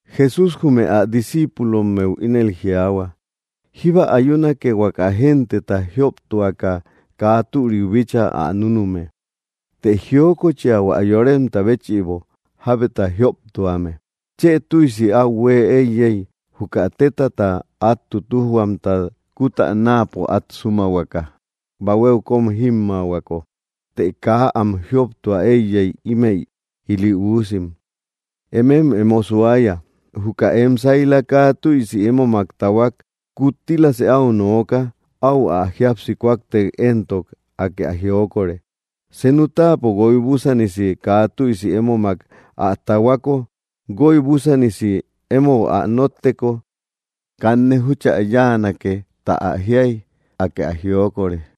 Jesús jume ä discíipulommeu ínel jiaahua: —Jíba ayunake huaka genteta jioptuaka kaa türiu bíchaa ä núnume. ¡Të jiokochia hua yoremta béchïbo jábeta jioptuame! Chë tüisi áu huée éiyey, juka téta át tutujhuamta kutänaapo át súmahuaka bahuéu kóm jímmaahuako, të kaa am jioptua éiyey ímëi ili uusim. ¡Emem emo suaya! ’Juka em saila kaa tüisi émomak tahuak kuttilasë áu nooka; áu ä jíapsi kúaktek éntok, Akë ä jiokore. Senu táapo guoy búsanisi kaa tüisi émomak ä tahuako, guoy búsanisi émou ä nótteko: “Kanne júchä yáanake tä jíay”, Akë ä jiokore.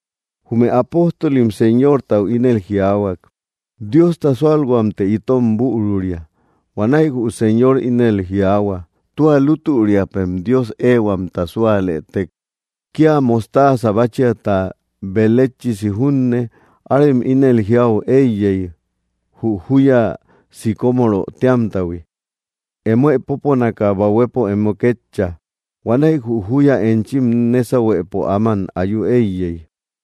Jume apóstolim Señortau ínel jiaahua: —Diosta súalhuamtë itot büruria. Huanäi jü Señor ínel jiaahua: —Tua lútüriapem Dios ehuamta súalëtek, kía mostaaza báchiata beletchisi junne, arem ínel jiäu éiyey jü júya sicómoro téamtahui: “Emoë póponaka bahuepo emo kétcha”, huanäi jü júya enchim nésahuepo áman ayu éiyey.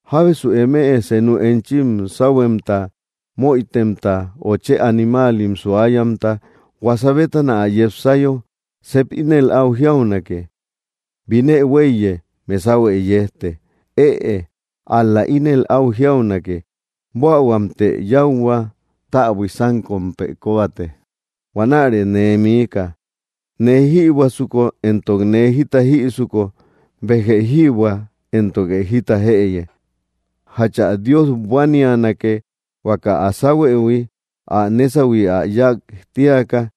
’Jábesu eme, senu enchim sáhuemta möitemta o chë animaalim suayamta, huasa bétana ä yepsayo, ¿sep ínel áu jiaunake: “Binë huéiye, mesahuë yejte”? Ëe, ál‑la ínel áu jiaunake: “Buähuamtë yáuhua, täbui sánkompë kóbate. Huanärë nee miika. Nee jïbuäsuko éntok nee jita jïsuko, béjë jïbuä, éntoke jita jëye.” ¿Jachu ä Dios buánianake, huaka ä sáhuëhui ä nésahui ä yák tíaka?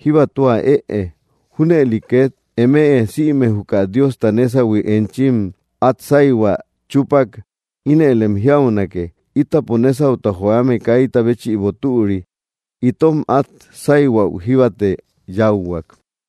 Jíba tua ëe. Júnëli két eme sïme juka Diosta nésahui enchim át sáyhuä chúpak, ínëlem jiaunake: “Ítapo nésauta joame kaita béchïbo türi; itom át sáyhuäu jíbate yáuhuak.”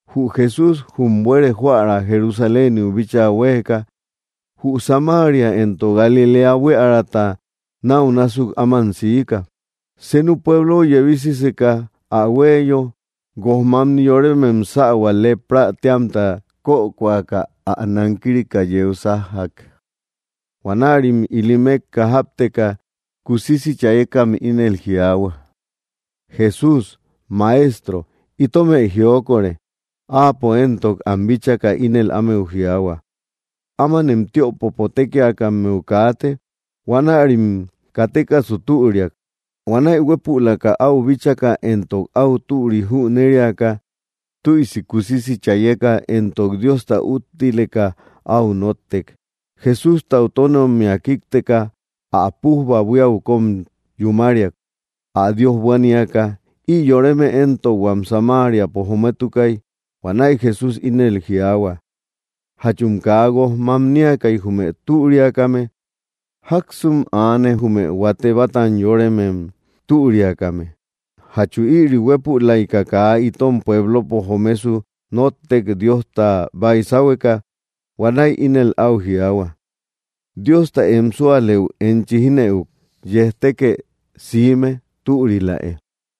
Jü Jesús jum buere joära Jerusaléniu bíchaa huéeka, jü Samaria éntok Galiléa buíärata náu násuk áman siika. Senu pueblou yebisiseka ä huéiyo, guojmamni yoremem sähua leprä téamta kökoaka ä nankirika yeu sájjak. Huanärim ili mékka jápteka, kusisi chayekam ínel jiaahua: —¡Jesús, Maestro, itomë jiokore! Áapo éntok am bíchaka ínel ámeu jiaahua: —Ámanem tiöpopo tékiakammeu kaate. Huanärim katekasu türiak. Huanäi huépülaka áu bíchaka éntok áu türi jüneriaka, tüisi kusisi chayeka éntok Diosta úttileka áu nóttek. Jesústau tónommia kíkteka, ä pújba buíau kóm yúmariak, ä Dios buaníaka. Ï yoreme éntok huam Samariapo jometukay. Huanäi Jesús ínel jiaahua: —¿Jachum kaa guojmamniakay jume türiakame? ¿Jáksum aane, jume huate bátan yoremem türiakame? ¿Jachu ïri huépülaika kaa itom pueblopo jomesu nóttek, Diosta baysahueka? Huanäi ínel áu jiaahua: —Diosta em súalëu enchi jínëuk. Yejtekë siime. Türiläe.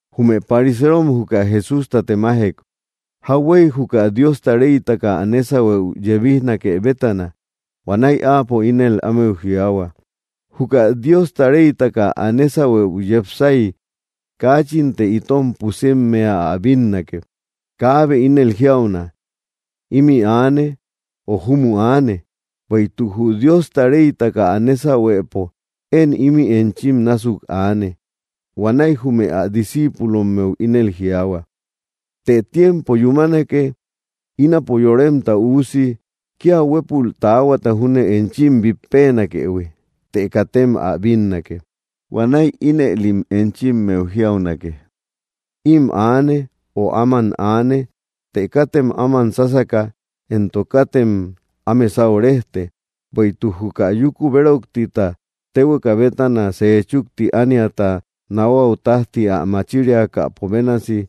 Jume pariseerom juka Jesústa temajek, jauhuey juka Diosta reytaka ä nésahueu yebijnake bétana. Huanäi áapo ínel ámeu jiaahua: —Juka Diosta reytaka ä nésahueu yepsay kaachinte itom pusimmea ä bínnake. Kaabe ínel jiauna: “Ímï aane”, o “Júmü aane”; bueïtuk jü Diosta reytaka ä nésahuepo én ímï enchim násuk aane. Huanäi jume ä discíipulommeu ínel jiaahua: —Të tiempo yúmanake ínapo Yoremta Üusi kía huépül taahuata júne enchim bít peenakëhui, të katem ä bínnake. Huanäi ínëlim enchimmeu jiaunake: “Ím aane”, o “Áman aane.” Të katem áman sásaka, éntok katem áme sáu rejte. Bueïtuk juka yúku béroktita téhueka bétana sejchúkti ániata nahuau tájti ä machiriakäpo bénasi,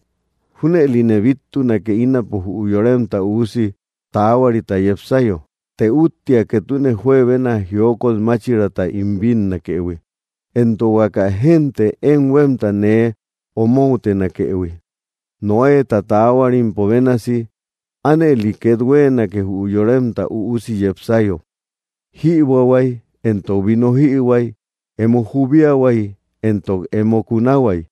junëline bíttunake ínapo jü Yoremta Üusi taahuarita yepsayo. Të úttia ketune juebena jiokot máchiraata ín bínnakëhui, éntok huaka génte én huémta nee omoutenakëhui. Noéta taahuarimpo bénasi, ánëli két huéenake, jü Yoremta Üusi yepsayo. Jïbuähuay, éntok vino jïhuay, emo jubiahuay éntok emo kunahuay,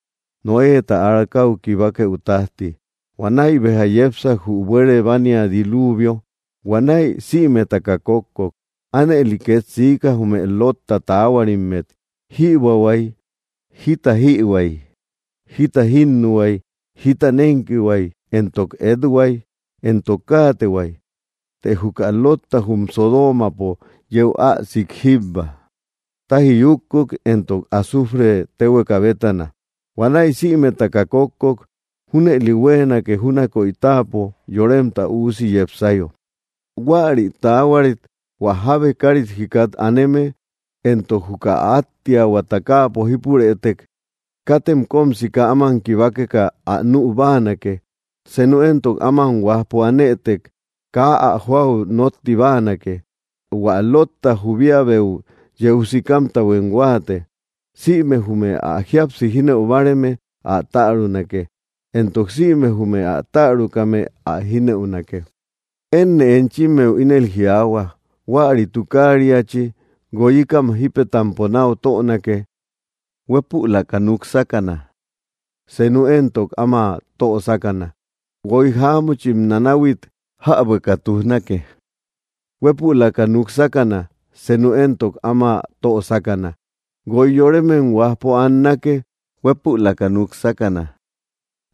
Noéta arcau kibakeu tájti. Huanäi béja yepsak, jü buere bánia diluuvio. Huanäi sïmetaka kókkok. Ánëli két siika, jume Lotta taahuarimmet: jïbuähuay, jita jïhuay, jita jínnuhuay, jita nénkihuay, éntok ethuay, éntok káatehuay; të juka Lotta jum Sodoomapo yeu ä sik jíbba, táji yúkkuk, éntok azufre téhueka bétana. Huanäi sïmetaka kókkok. Júnëli huéenake júnakoy táapo Yoremta Üusi yepsayo. ’Huäri taahuarit hua jábe kárit jikat aneme, entok juka áttiahuata káapo jípurëtek, katem kóm sika áman kibakeka ä nü báanake; senu éntok áman huajpo anëtek, kaa ä jóau nótti báanake. Huä Lotta jubiabeu yeu sikamtahuem huáate. Sïme jume ä jíapsi jínëu báareme ä tärunake. Éntok sïme jume ä tärukame ä jínëunake. ’Énne enchimmeu ínel jiaahua, huäri tukaariachi guoyikam jípetampo náu tönake. Huépülaka núk sákana; senu éntok áma tö sákana. Guoy jáamuchim nanahuit jäbueka tujnake. Huépülaka núk sákana; senu éntok áma tö sákana. Guoy yoremem huajpo annake; huépülaka núk sákana;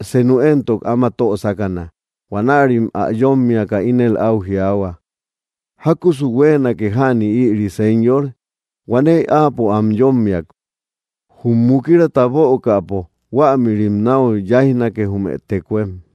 senu éntok áma tö sákana. Huanärim ä yómmiaka, ínel áu jiaahua: —¿Jákusu huéenake jäni ïri, Señor? Huanäi áapo am yómmiak: —Jum mukirata bökäpo, huämïrim náu yáijnake, jume tekuem.